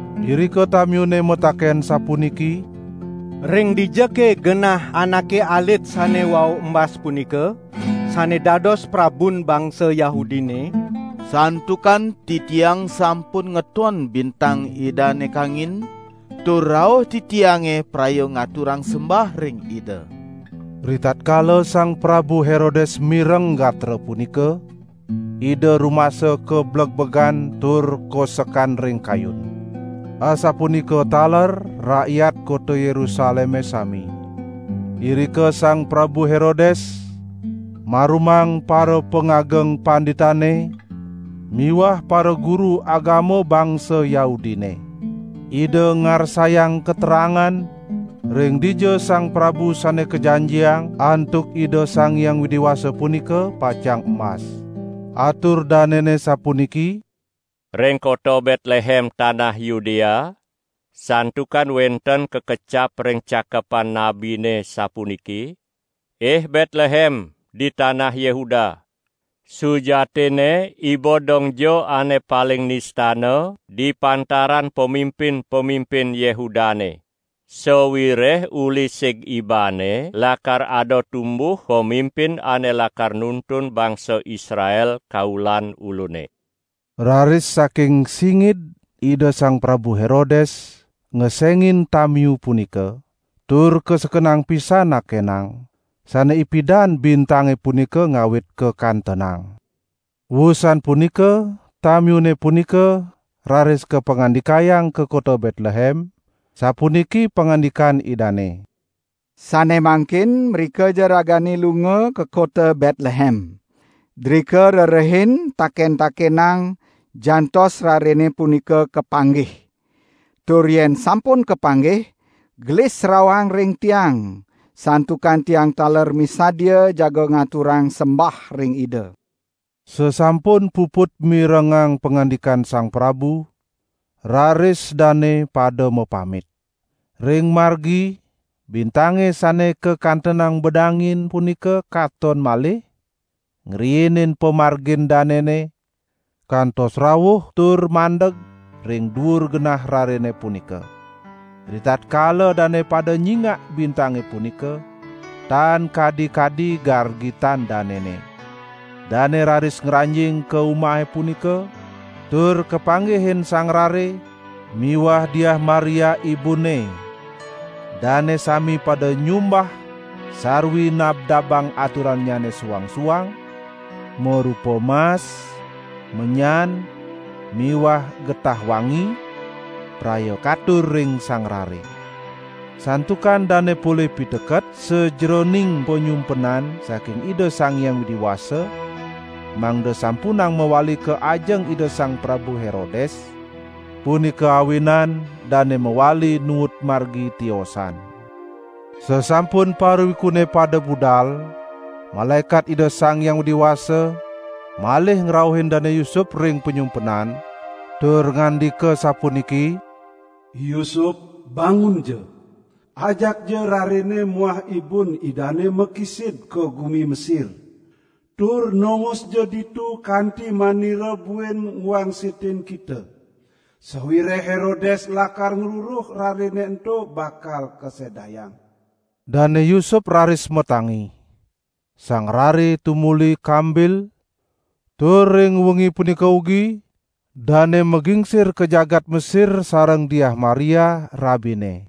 Irika tamiune mataken sapuniki: "Ring dijake genah anake alit sane wau embas punika sane dados prabun bangsa Yahudine? Santukan titiang sampun ngeton bintang Idane kangin, tur rauh titiange praya ngaturang sembah ring Ida." Ritatkala Sang Prabu Herodes mireng gatra punika, ida rumasa kablegbegan tur kosekan ring kayun. Asapunika taler rakyat kota Yerusaleme sami. Irika Sang Prabu Herodes marumang parapangageng panditane miwah paraguru agama bangsa Yahudine. Ida ngarsayang katerangan ring dija Sang Prabu Sane Kajanjiang antuk Ida Sang Hyang Widi Wasa punika pacang embas. Atur danene sapuniki: "Ring kota Betlehem tanah Yudea, santukan wenten kakecap ring Cakepan Nabine sapuniki: 'Ih Betlehem di tanah Yehuda, sujatinne iba dongja ane paling nistana di pantaran pamimpin-pamimpin Yehudane. Sawireh uli sig ibane lakar ada tumbuh pamimpin ane lakar nuntun bangsa Israel kaulan Ulune.' " Raris saking singid Ida Sang Prabu Herodes ngesengin tamiu punika, tur kasekenang pisan nakenang, sane ipidan bintange punika ngawit kakantenang. Wusan punika tamiune punika raris kapangandikayang ka kota Betlehem, sapuniki pangandikan idane: "Sane mangkin mrikaja ragane lunga ka kota Betlehem. Drika rerehin taken-takenang jantos rarene punika kapanggih. Tur yen sampun kapanggih, gelis rauhang ring tiang, santukan tiang taler misadia jaga ngaturang sembah ring Ida." Sasampun puput mirengang pangandikan sang prabu, raris dane pada mapamit. Ring margi bintange sane kakantenang bedangin punika katon malih, ngriinin pamargin danene, kantos rauh tur mandeg ring duur genah rarene punika. Ritatkala dane pada nyingak bintange punika, tan kadi-kadi gargitan danene. Dane raris ngranjing ka umahe punika tur kapanggihin sang rare miwah Diah Maria ibunne. Dane sami pada nyumbah sarwi nabdabang aturannyane suang-suang marupa: mas, menyan miwah getah wangi, praya katur ring sang rare. Santukan dane polih piteket sajeroning panyumpenan saking Ida Sang Hyang Widi Wasa, mangda sampunang mawali ka ajeng Ida Sang Prabu Herodes, punika awinan dane mawali nuut margi tiosan. Sasampun parawikune pada budal, malaekat Ida Sang Hyang Widi Wasa malih ngrauhin Dane Yusup ring panyumpenan, tur ngandika sapuniki: "Yusup, bangunja! Ajakja rarene muah ibun Idane makisid ka gumi Mesir, tur nongosja ditu kanti manira buin ngwangsitin kita. Sawireh Herodes lakar ngruruh rarene ento bakal kasedayang." Dane Yusup raris matangi, sang rare tumuli kambil, tur ring wengi punika ugi dane magingsir ka jagat Mesir sareng Diah Maria, rabine.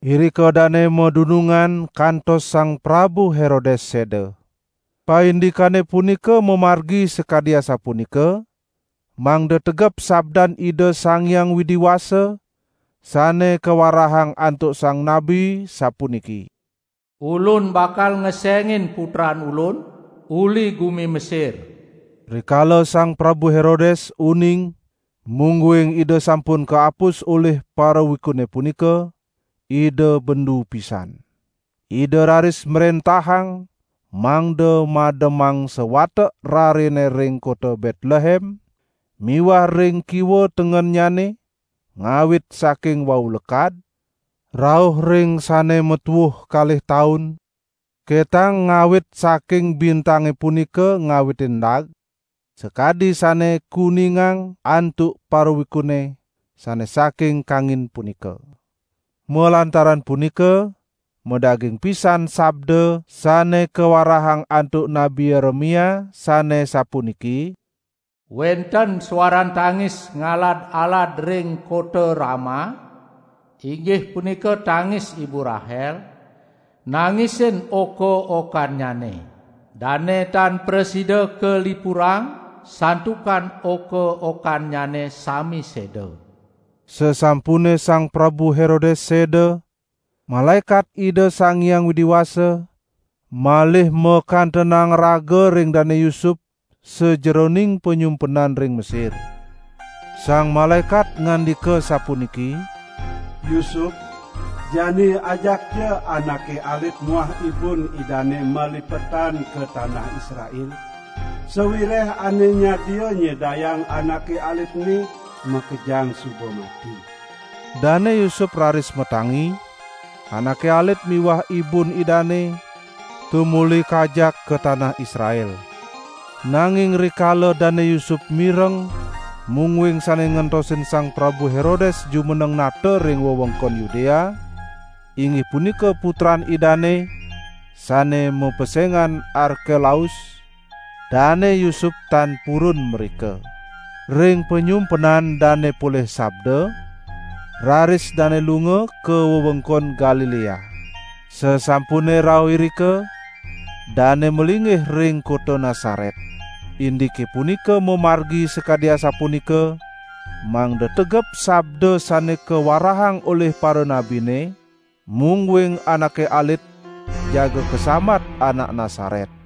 Irika dane madunungan kantos Sang Prabu Herodes seda. Paindikane punika mamargi sakadi asapunika, mangda tegep sabdan Ida Sang Hyang Widi Wasa sane kawarahang antuk sang nabi sapuniki: "Ulun bakal ngesengin Putran Ulun uli gumi Mesir." Rikala Sang Prabu Herodes uning mungguing ida sampun kaapus olih parawikune punika, ida bendu pisan. Ida raris mrentahang mangda mademang sawatek rarene ring kota Betlehem miwah ring kiwa tengennyane, ngawit saking wau lekad, rauh ring sane matuuh, ketang ngawit saking bintange punika ngawitin endag, sakadi sane kuningang antuk parawikune sane saking kangin punika. Malantaran punika madaging pisan sabda sane kawarahang antuk Nabi Yeremia sane sapuniki: "Wenten suaran tangis ngalad-alad ring kota Rama, inggih punika tangis Ibu Rahel, nangisin oka-okannyane. Dane tan prasida kalipurang santukan oka-okannyane sami seda." Sasampune Sang Prabu Herodes seda, malaekat Ida Sang Hyang Widi Wasa malih makantenang raga ring Dane Yusup sajeroning panyumpenan ring Mesir. Sang malaekat ngandika sapuniki: "Yusup, jani ajakja anake alit muah ibun Idane malipetan ka tanah Israel, sawireh ane nyadia nyedayang anake alit ene, makejang suba mati." Dane Yusup raris matangi, anake alit miwah ibun Idane tumuli kajak ka tanah Israel. Nanging rikala Dane Yusup mireng mungguing sane ngentosin Sang Prabu Herodes jumeneng nata ring wewengkon Yudea, inggih punika putran idane, sane mapesengan Arkelaus, Dane Yusup tan purun mrika. Ring panyumpenan dane polih sabda, raris dane lunga ka wewengkon Galilea. Sasampune rauh irika, dane malinggih ring kota Nasaret. Indike punika mamargi sakadi asapunika, mangda tegep sabda sane kawarahang olih paranabine, mungguing anake alit jaga kasambat Anak Nasaret.